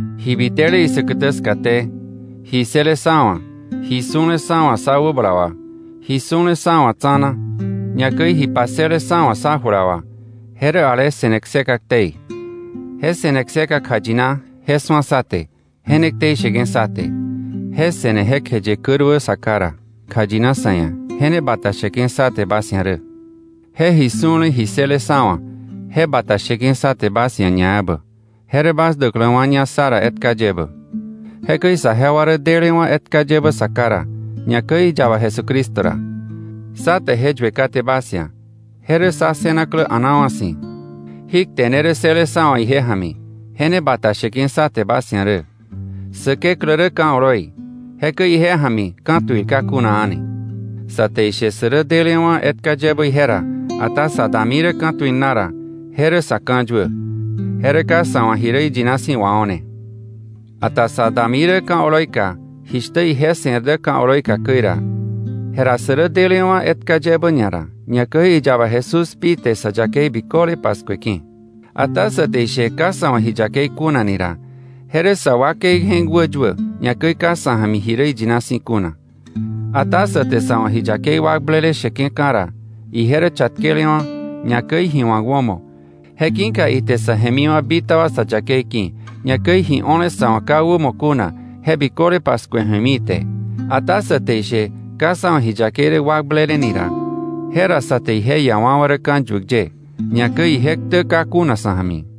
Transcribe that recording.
Ji bitele isäkätä skaté, ji ssële sá wa̱, ji su̱le sá wa̱ sá wäbala wà, ji su̱lewa̱ sá wa̱ tsa̱na, ñakäi ji passële sá wa̱ sá jula wà, je rä ale se̱ne kseka ktei; je se̱ne kseka kjayina, je su̱a sá te, je ne ktei sheke̱ sá te. Je se̱ne jekjeye käruä Sa Ká ra, kjayina sa̱ ia̱, je ne bata sheke̱ sá te bas ia̱ rä. Je ji su̱le ji ssële sá wa̱, je bata sheke̱ sá te bas ia̱ ñaebä, je rä bas däkläwa̱ña sá ra etka yebä. Jekäi saje wa rä delewa̱ etka yebä Sa Ká ra, ñakäi iyaba Jesucristo ra. Sá te je yue kate bas ia̱, je rä sá ssënaklä a̱naawa̱ si̱. Jí kte ne rä ssële sá wa̱ ije ja̱mi, je ne bata sheke̱ sá te bas ia̱ rä: Säkeklä rä ka̱ oloi, jekäi ije ja̱mi ka̱tuil ka kuna a̱ni. Sa te ishe sä rä delewa̱ etka yebä ije ra, ata sa dami rä ka̱tuil na ra, je rä sa̱ ka̱yuä, je rä ka sa̱ wa̱ ji rä iyina si̱ wao̱ne. Ata sa dami rä ka̱ oloi ka, jishtä ije se̱r dä ka̱ oloi ka käi ra, jera sä rä delewa̱ etka yebä ñara, ñakäi iyaba Jesús pi te sa yakei biköle paskueke̱. Ata sä te ishe ka sa̱ wa̱ ji yakei kuna ni ra, je rä sa wakei je̱k wäyuä, ñakäi ka sa̱ ja̱mi ji rä iyina si̱ kuna. Ata sä te sa̱ wa̱ ji yakei wakblele sheke̱ka̱ ra, ije rä chatkelewa̱, ñakäi ji wa̱k wämo, je ki̱ka ite sä jemiwa̱ bitaba sa yakei ki̱, ñakäi ji o̱le sa̱ wa̱ ka wämo kuna, je biköle paskue ju̱emi ite. Ata sä te ishe ka sa̱ wa̱ ji yakei rä wakblele ni ra, jera sa te ije iawa̱wa̱ rä ka̱yuäk ye, ñakäi ije ktä ka kuna sa̱ ja̱mi.